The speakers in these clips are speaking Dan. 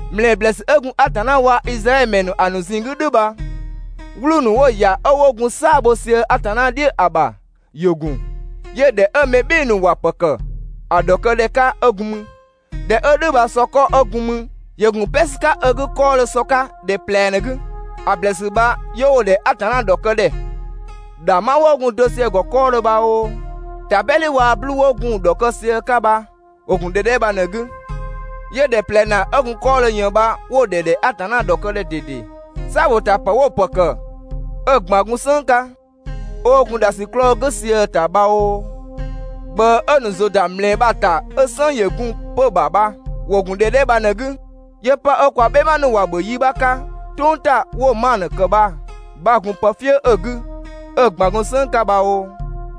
‑Mlɛɛ ‑blɛɛsü 'ö gun Atanna waa Izraɛdhö ‑mɛ ‑nu ‑a ‑nu ꞊zinng 'gü "dhʋ̈ bha, 'wluu‑ ‑nu 'wo‑ ‑ya 'ö 'wo gun "saa‑ bho sië Atanna "dhiʋ̈ ‑a ‑bha ‑yö ‑gun, 'yö ‑dhɛ 'ö mɛ "bhɩɩ‑ ‑nu ‑wa ‑pë ‑kë ‑a ‑dhɔkëdhɛ 'ka 'ö gun mü. ‑Dhɛ 'ö "dhʋ̈ bha sɔkɔ 'ö gun 'mü ‑yö ‑gun "pɛ ‑sü 'ka 'ö 'gü 'kɔɔdhö sɔ 'ka ‑dhɛ ꞊plɛ ꞊në‑ 'gü. ‑A ‑blɛɛsü bha 'yö 'wo‑ ‑dhɛ Atanna ‑dhɔkë ‑dhɛ. ‑Dhangbha 'wo gun‑ dɔ sië‑ ‑gɔ 'kɔɔdhö bha oo, ‑tabɛdhi waa‑ 'bluu‑ 'wo gun‑ ‑dhɔkë sië‑ 'ka bha, ‑wo ‑gun ‑dhɛ 'dhɛ bha ꞊në‑ 'gü. 'Yö ‑dhɛ ꞊plɛ ‑naa 'ö gun 'kɔɔdhö ꞊yën bha 'wo‑ ‑dhɛ ‑dhɛ Atanna ‑dhɔkë ‑dhɛ ꞊dede. "Saa‑ ‑bho ‑ta ‑pë 'wo‑ ‑pë ‑kë 'ö‑ ꞊gban gun "sënng 'ka, 'ö 'wo gun ‑dhasiklɔɔ "gʋ̈ sië‑ ‑ta bha oo, ꞊gbëë 'ö‑ ‑nu ‑zʋ ‑da ‑mlɛɛ bha‑ ‑ta 'ö "sënng ‑yö gun‑ 'pö‑ ‑bha bha, ‑wo ‑gun ‑dhɛ 'dhɛ bha ꞊në‑ 'gü. 'Yö 'pë 'ö kwa "bhɛma ‑nu ‑wa ‑bhö yi 'bha 'ka "tʋng ‑ta 'wo‑ manö ‑kë bha‑ 'bha‑ gun pë "fië 'ö‑ 'gü 'ö‑ ꞊gban gun "sënng 'ka bha oo,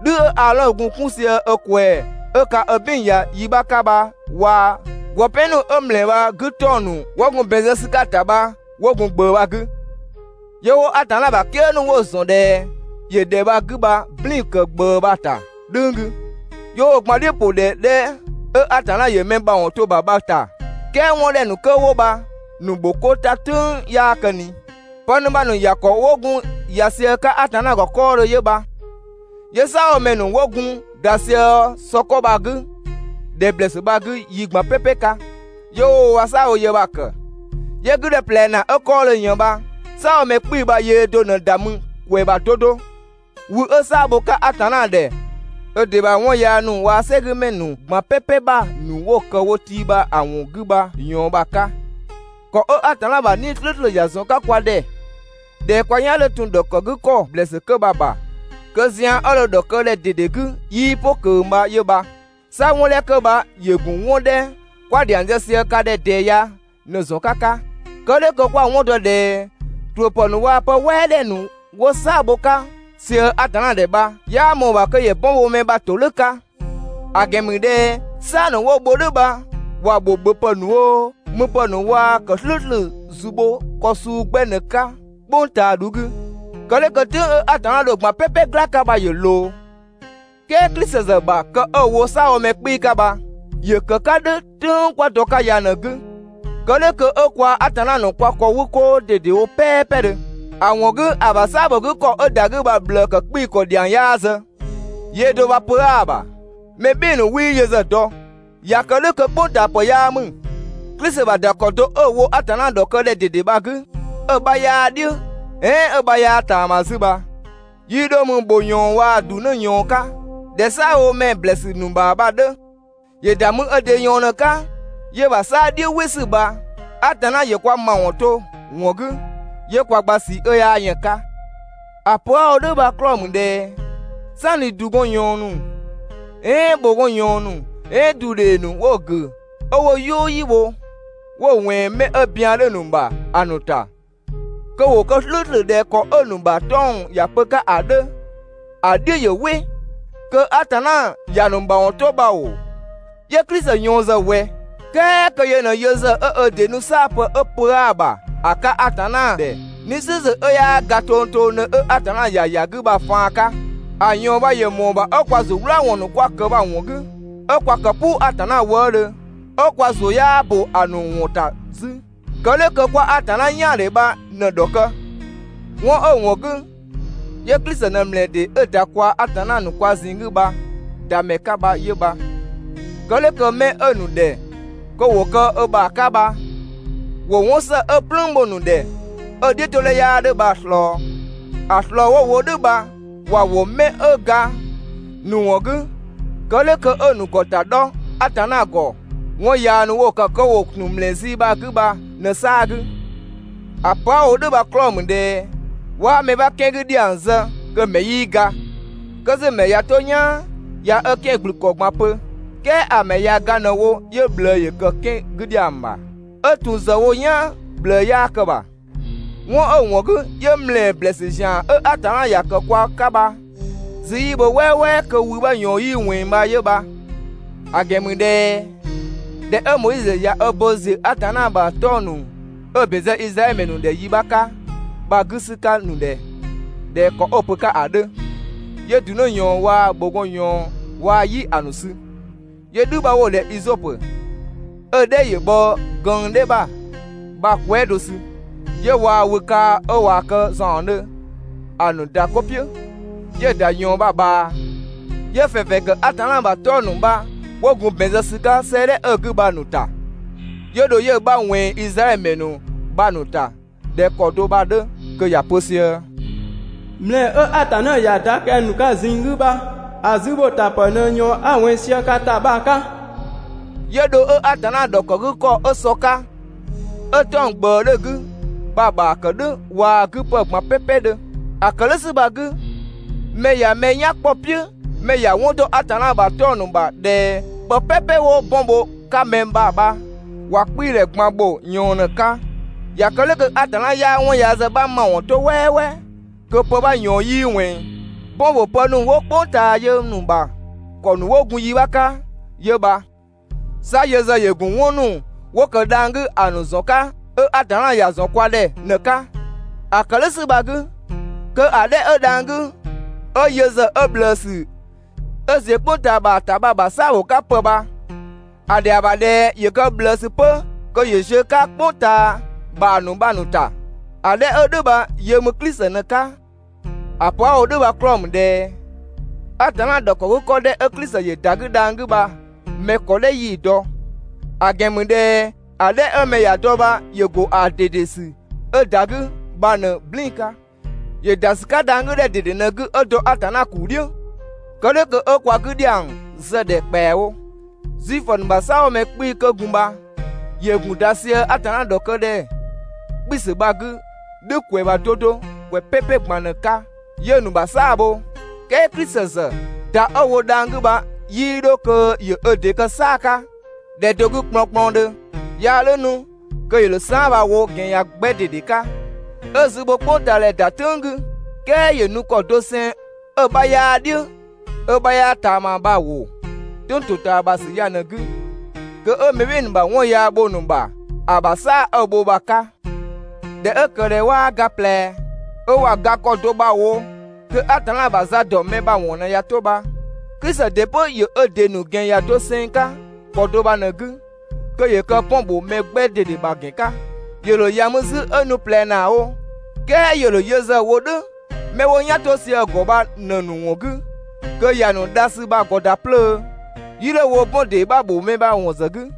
"dhü 'ö Aadhɔn gun‑ 'kun sië ö ꞊kwɛɛ‑ 'ö ka ö "bin ‑ya yi 'bha 'ka bha waa‑ ‑gwë "pɛn ‑nu 'ö ‑mlɛɛ bha‑ 'gü 'tɔng‑ ‑nu 'wo gun ‑bɛn zë ‑sü 'ka‑ ‑ta bha 'wo gun ꞊gbëë bha‑ 'gü. 'Yö 'wo Atanna ‑bha "kië ‑nu 'wo‑ ‑zɔn ꞊dhɛ ‑yö ‑dhɛ bha‑ 'gü bha‑ "blɛɛn‑ ‑kë ꞊gbëë bha‑ ‑ta "dhʋ̈ng 'gü. 'Yö 'wo‑ gban "dhiʋ̈ ‑pʋ ‑dhɛ 'dhɛ 'ö Atanna ‑yö mɛ ‑mawɔn to‑ ‑bha bha‑ ‑ta. "Kɛɛ 'wɔn 'dhɛ ‑nu 'kö 'wo bha‑ ‑nu ‑bho 'ko ‑ta "tʋ̈ng 'yaa kë ꞊ni. Pë ‑nu bha‑ ‑nu ‑ya ‑kɔ 'wo gun ‑ya sië‑ 'ka Atanna ‑gɔ 'kɔɔdhö 'yö bha. 'Yö "saabhomɛ ‑nu 'wo gun ‑da sië sɔkɔ bha‑ 'gü ‑dhɛ ‑blɛɛsü bha‑ 'gü yi ꞊gban "pɛpɛ 'ka, 'yö 'wo wo ‑bha "saabhoyë bha‑ ‑kë. 'Yö‑ 'gü ‑dhɛ ꞊plɛ ‑naa 'ö 'kɔɔdhö ꞊yën bha "saabhomɛ 'kpii‑ bha yöö do ꞊në ‑da mü ‑kwɛ ‑bha 'do 'do, wü 'ö "saa‑ bho‑ 'ka Atanna ‑dhɛ ö ‑dɩ ‑bha 'wɔn yaa ‑nu waa‑ "sɛgümɛ ‑nu ꞊gban "pɛpɛ ‑bha ‑nu 'wo‑ ‑kë wo tii ‑bha ‑a ‑wɔn 'gü bha‑ ꞊yɔɔn bha‑ 'ka. ‑Kɔ 'ö Atanna ‑bha 'Nii‑ "slʋ̈ʋ̈slʋ̈ ‑ya ‑zɔn 'ka kwa ‑dhɛ ꞊dhɛ kwa "yan 'dhö ‑tun ‑dhɔkë 'gü ‑kɔ ‑blɛɛsü 'kö bha‑ ‑bha, kö zian 'ö dho‑ ‑dhɔkë ‑dhɛ ꞊dede 'gü 'yii "pʋ ꞊kö bha 'yö bha. 'Sa 'wɔn 'dhɛ 'kö bha ‑yö ‑gun 'wɔn 'dhɛ 'kwa‑ ‑dhiang zë sië ka ‑dhɛ ꞊dɛɛ ya ꞊në‑ zɔn 'ka 'ka. Kë "dhʋ̈ kö 'kwa‑ 'wɔn dɔ ꞊dhɛ ‑tuʋ̈pë ‑nu waa‑ pë "wɛɛdhɛ ‑nu 'wo "saa‑ bho‑ 'ka ꞊sië Atanna ‑dhɛ bha‑ 'bha 'yaa ꞊mɔɔ‑ ‑bha kö ‑yö bɔn bho mɛ ‑bha ‑todhʋ̈ 'ka. ‑A ‑gɛn ‑mü ꞊dhɛ "saa‑ ‑nu 'wo‑ bho "dhʋ̈ bha ‑wa ‑bho ‑bhöpë ‑nu oo, müpë ‑nu waa‑ ‑kë "slʋ̈ʋ̈slʋ̈ ‑zu bho ‑kɔ suu 'gbɛ ꞊në‑ 'ka "kpʋng ꞊taa 'dhu 'gü. Kë "dhʋ̈ kö "tʋ̈ng 'ö Atanna dho‑ ꞊gban "pɛpɛ "gla‑ 'ka bha ‑yö ꞊loo. "Kɛɛ Klisi ‑zë ‑bha kë 'ö‑ wo "saabhomɛ 'kpii‑ 'ka bha, ‑yö ‑kë 'ka "dhʋ̈ "tʋ̈ng 'kwa dɔ‑ 'ka ya ꞊në‑ 'gü. Kë "dhʋ̈ kö 'ö kwaa‑ Atanna ‑nu kwa ‑kɔ 'wü 'koo ꞊dedewo "pɛɛpɛdhö. ‑A ‑wɔn 'gü, ‑a ‑bha "saa‑ ‑bho 'gü ‑kɔ 'ö ‑da 'gü bha‑ ꞊bhlëë ‑kë 'kpii‑ ‑kɔ ‑dhiang 'yaa zë, yöö do bha pö 'aa‑ ‑bha. Mɛ "bhɩɩ‑ ‑nu 'wii yö ‑zë dɔ. ꞊Ya kë "dhʋ̈ kö "kpʋngtaapë 'yaa ‑mü. Klisi ‑bha ‑da ‑kɔ do 'ö‑ wo Atanna ‑dhɔkë ‑dhɛ ꞊dede bha‑ 'gü 'ö‑ 'bha 'yaa‑ "dhiʋ̈ "ɛɛn 'ö‑ 'bha 'yaa‑ ꞊taama 'zü bha, 'yii dho mü ‑bhʋ ꞊yɔɔn waa‑ ‑dunë ꞊yɔɔn 'ka ꞊dhɛ "saabhomɛ ‑blɛɛsü ‑nu ‑bha bha‑ 'dhö, ‑yö ‑da mü ö ‑dɩ ꞊yɔɔn ꞊në‑ 'ka, 'yö‑ ‑bha 'saa‑ "dhiʋ̈ "wɩ ‑sü bha Atanna ‑yö kwa ‑mawɔn to‑ ‑wɔn 'gü 'yö kwa gba ꞊sii 'ö 'yaa yën ‑a 'ka. ‑A pö 'a‑ wo "dhʋ̈ bha‑ 'klɔɔ‑ ‑mü ꞊dhɛ "sanni ‑du gɔn ꞊yɔɔn ‑nu, "ɛɛn ‑bhʋgɔn ꞊yɔɔn ‑nu, "ɛɛn ‑du ‑dhee ‑nu 'wo‑ ‑gʋ̈ 'ö 'wo‑ "yʋʋ "yi bho 'wo‑ ꞊wɛnng 'mɛ 'ö bian 'dhö‑ ‑nu ‑bha ‑a ‑nu ‑ta kö ‑wo kë "slʋ̈ʋ̈slʋ̈ ꞊dhɛ ‑kɔ 'ö‑ ‑nu ‑bha 'tɔng‑ ‑ya pö‑ 'ka ‑a 'dhö ‑a "dhiʋ̈ ‑yö "wɩ, kö Atanna ‑ya ‑nu ‑ma ‑wɔn 'to bha ‑oo, 'yö Klisi ꞊yɔɔn ‑zë ꞊wɛ? "Kɛɛ kö yö ꞊në yö ‑zë 'ö ö ‑dɩ nu "saapë 'ö pö 'aa‑ ‑bha ‑a 'ka Atanna ‑dhɛ 'Nii‑ "slʋ̈ʋ̈slʋ̈ 'ö 'yaa ga tongtongdhö 'ö Atanna ‑ya ‑ya 'gü bha‑ faan 'ka. ‑A ꞊yɔɔn bha ‑yö ‑mɔɔ ‑bha 'ö kwa ‑zu "wlaawɔn ‑nu 'kwa‑ ‑kë bha‑ ‑wɔn 'gü, 'ö 'kwa ‑kë "puu Atanna wëëdhö, 'ö kwa ‑zʋ 'yaa ‑bö ‑a ‑nu ‑wɔn ‑ta 'zü. Kë "dhʋ̈ kö 'kwa Atanna "yaandhe bha ꞊në‑ ‑dhɔkë. 'Wɔn 'ö‑ ‑wɔn 'gü, 'yö Klisi ꞊në ‑mlɛɛ ‑dee 'ö ‑da kwaa‑ Atanna ‑nu kwa ꞊zinng 'gü bha‑ ‑da ‑mɛ 'ka bha 'yö bha. Kë "dhʋ̈ kö 'mɛ 'ö‑ ‑nu ‑dhɛ kö ‑wo kë ö ‑bha 'ka bha ‑wo 'wɔn ‑së 'ö‑ "plüün bho‑ ‑nu ‑dhɛ 'ö‑ "dhiʋ̈todhɛ 'yaa 'dhö bha‑ ꞊slɔɔ. ‑A ꞊slɔɔ 'wo‑ wo "dhʋ̈ bha ‑wa ‑wo 'mɛ 'ö ga‑ ‑nu ‑wɔn 'gü, kë "dhʋ̈ kö 'ö‑ ‑nu ‑gɔ ‑ta 'dhɔ Atanna ‑gɔ 'wɔn yaa ‑nu 'wo‑ ‑kë kö ‑wo ‑tun ‑mlɛɛ zii bha‑ 'gü bha ꞊në‑ 'saa‑ 'gü. ‑A pö 'a‑ wo "dhʋ̈ bha‑ 'klɔɔ‑ ‑mü ꞊dhɛ 'waa mɛ 'bha 'kɛan‑ 'gü ‑dhiang zë kö‑ ‑mɛ 'yii ga. 'Kö 'zü‑ ‑mɛ ꞊ya 'to "yaan ꞊ya ö 'kɛan‑ ‑gblü ‑kɔ ꞊gban pö, "kɛɛ ‑a ‑mɛ ꞊ya ga ꞊në‑ wo 'yö ꞊bhlëë ‑yö ‑kë 'kɛan‑ 'gü ‑dhiang ‑bha. 'Ö ‑tun ‑zë bho "yaan ꞊bhlëë 'yaa kë‑ ‑bha. 'Wɔn 'ö‑ ‑wɔn 'gü, 'yö ‑mlɛɛ ‑blɛɛsü ‑zian 'ö Atanna ‑ya ‑kë kwa 'ka bha‑ zü 'yii bho "wɛɛwɛɛ kö wü 'bha ꞊yɔɔn 'yii ꞊wɛnng bha 'yö bha. ‑A ‑gɛn ‑mü ꞊dhɛ ꞊dhɛ 'ö Moizö ꞊ya ö bo ‑ziö Atanna ‑bha 'tɔng‑ ‑nu 'ö‑ ‑bɛn zë Izraɛdhö ‑mɛ ‑nu ‑dhɛ yi 'bha 'ka bha‑ 'gü ‑sü 'ka‑ ‑nu ‑dhɛ ꞊dhɛ ‑kɔ 'ö‑ pö‑ 'ka ‑a 'dhö, 'yö ‑du 'në ꞊yɔɔn waa‑ ‑bhʋgɔn ꞊yɔɔn waa‑ "yi ‑a ‑nu sü, 'yö "dhü 'bha 'wo‑ ‑dhɛ izɔpö, ('ö‑ "dhɛ ‑yö bhɔ gënng "dhɛ ‑bha) bha‑ kwɛɛ" do sü, 'yö waa wü kaa‑ 'ö ꞊waa‑ kë ‑zaɔndhö ‑a ‑nu ‑da 'ko "piʋ̈, 'yö‑ ‑da ꞊yɔɔn bha‑ ꞊bhaa, 'yö‑ ‑fɛnfɛn ‑kë Atanna ‑bha 'tɔng‑ ‑nu bha 'wo gun ‑bɛn zë ‑sü 'ka 'sëëdhɛ 'ö‑ 'gü bha‑ ‑nu ‑ta, 'yö dho 'yö‑ 'bha ꞊wɛnng Izraɛdhö ‑mɛ ‑nu bha‑ ‑nu ‑ta ꞊dhɛ ‑kɔ do bha‑ 'dhö kö ‑ya pö sië: «‑Mlɛɛ 'ö Atanna ‑ya ‑da kɛng‑ ‑nu ka ꞊zinng 'gü bha, ‑a zü ‑bho ‑ta ‑pë ꞊në ꞊yɔɔn 'a‑ ꞊wɛnng sië ka ‑ta bha‑ 'ka.» 'Yö dho 'ö Atanna ‑dhɔkëgükɔ 'ö sɔ 'ka, ('ö 'tɔng‑ ꞊gbëë 'dhö‑ 'gü) bha‑ ‑bha ‑kë "dhʋ̈ waa‑ 'gü ‑pë ꞊gban "pɛpɛ 'dhö. ‑A ‑kë "dhʋ̈ ‑sü bha‑ 'gü, mɛ ꞊ya mɛ "yan kpɔ‑ "piʋ̈, mɛ ‑ya 'wɔn ‑dɔ Atanna ‑bha 'tɔng‑ ‑nu ‑bha ꞊dhɛ pë "pɛpɛ 'wo 'bɔn bho‑ 'ka mɛ ‑bha bha, ‑wa 'kpii‑ ‑dhɛ ꞊gban ‑bho ꞊yɔɔn ꞊në‑ 'ka. ꞊Ya kë "dhʋ̈ kö Atanna 'yaa 'wɔn yaa ‑zë 'bha ‑mawɔn 'to "wɛɛwɛɛ kö pë 'bha ꞊yɔɔn 'yii ꞊wɛnng. 'Bɔn ‑bho pë ‑nu 'wo "kpʋng ꞊taa yö‑ ‑nu ‑bha ‑kɔ ‑nu 'wo gun yi 'bha 'ka 'yö bha. 'Sa yö ‑zë ‑yö ‑gun 'wɔn ‑nu 'wo ‑kë dhang‑ 'gü ‑a ‑nu ‑zɔn 'ka 'ö Atanna ‑ya ‑zɔn kwa ‑dhɛ ꞊në‑ 'ka. ‑A ‑kë "dhʋ̈ ‑sü bha‑ 'gü, kö ‑a 'dhɛ 'ö dhang‑ 'gü 'ö yö ‑zë 'ö ꞊bhlëësü 'ö ‑ziö "kpʋng ꞊taa ‑bha ‑ta bha‑ ‑bha "saa‑ ‑bho 'ka ‑pë bha, ‑a ‑dhɛa ‑bha ꞊dhɛ ‑yö kë ꞊bhlëësü 'pö kö ‑yö ziö‑ 'ka "kpʋng ꞊taa ‑bha ‑nu bha‑ ‑nu ‑ta. ‑A 'dhɛ 'ö "dhʋ̈ bha yö ‑mü Klisi ꞊në‑ 'ka. ‑A pö 'a‑ wo "dhʋ̈ bha‑ 'klɔɔ‑ ‑mü ꞊dhɛ Atanna ‑dhɔkëgükɔ 'dhɛ 'ö Klisi ‑yö ‑da 'gü dhang‑ 'gü bha mɛ ‑kɔ "dhɛ 'yii‑ dɔ, ‑a ‑gɛn ‑mü ꞊dhɛ ‑a 'dhɛ 'ö mɛ ‑ya dɔ bha ‑yö ‑gun ‑a ꞊dede ‑sü 'ö ‑da 'gü bha ꞊në‑ "blɛɛn‑ 'ka. ‑Yö ‑da ‑sü 'ka dhang‑ 'gü ‑dhɛ ꞊dede ꞊në‑ 'gü 'ö dɔ Atanna ‑kuu "dhiʋ̈. Kë "dhʋ̈ kö 'ö kwa 'gü ‑dhiang zë‑ ‑dhɛ ‑kpɛawo. Zuifö ‑nu ‑bha "saabhomɛ 'kpii‑ 'kö 'wo gun bha ‑wo ‑gun ‑da sië Atanna ‑dhɔkë ‑dhɛ 'kpiisü bha‑ 'gü "dhʋ̈ ‑kwɛ ‑bha 'do 'do ‑kwɛ "pɛpɛ ꞊gban ꞊në‑ 'ka, 'yö 'wo‑ ‑nu ‑bha "saa‑ bho, "kɛɛ Klisi ‑zë ‑da 'ö‑ wo dhang‑ 'gü bha 'yii 'dho kö ‑yö ö ‑dɩ kë "saa‑ 'ka ‑dhɛ do 'gü kplɔnkplɔndhö. 'Yaa "dhʋ̈ 'nu kö ‑yö ‑dho saan" bha‑ wo ‑gɛn ‑yan 'gbɛ ꞊dede 'ka, 'ö‑ zü bho "kpʋng ꞊taa ‑dhɛ ‑da "tʋ̈ng 'gü. "Kɛɛ ‑yö nu ‑kɔ doseng 'ö‑ 'bha 'yaa‑ "dhiʋ̈ 'ö‑ 'bha 'yaa‑ ꞊taama bha‑ ‑wo "tʋ̈ng ‑totaamasü ya ꞊në‑ 'gü kö 'ö mɛ "bhɩɩ‑ ‑nu ‑bha 'wɔn yaa bho‑ ‑nu ‑bha ‑a ‑bha "saa‑ 'ö‑ bho bha‑ 'ka. ꞊Dhɛ 'ö ‑kë ꞊dhɛ 'waa ga ꞊plɛ, 'ö ꞊wa ga ‑kɔ do bha‑ wo kö Atanna ‑bha za ‑dɔ mɛ ‑bha ‑wɔn ꞊në ꞊ya 'to bha, Klisi ‑dɩ 'pö ‑yö ö ‑dɩ ‑nu ‑gɛn ‑yan doseng 'ka ‑kɔ do bha ꞊në‑ 'gü kö ‑yö kë 'bɔn ‑bho mɛ 'gbɛ ꞊dede ‑bha ‑gɛn 'ka, ‑yö ‑dho ‑ya mü 'zü 'ö nu ꞊plɛ ‑naa wo, "kɛɛ ‑yö ‑dho yö ‑zë wo "dhʋ̈ 'mɛ 'wo "yan 'to sië‑ ‑gɔ bha ꞊në‑ ‑nu ‑wɔn 'gü kö ‑ya ‑nu dha ‑sü bha‑ ‑gɔ ‑da 'plöö, 'yii 'dho‑ wo 'bɔn ‑dee 'bha ‑bho mɛ ‑bha ‑wɔn ‑zë 'gü.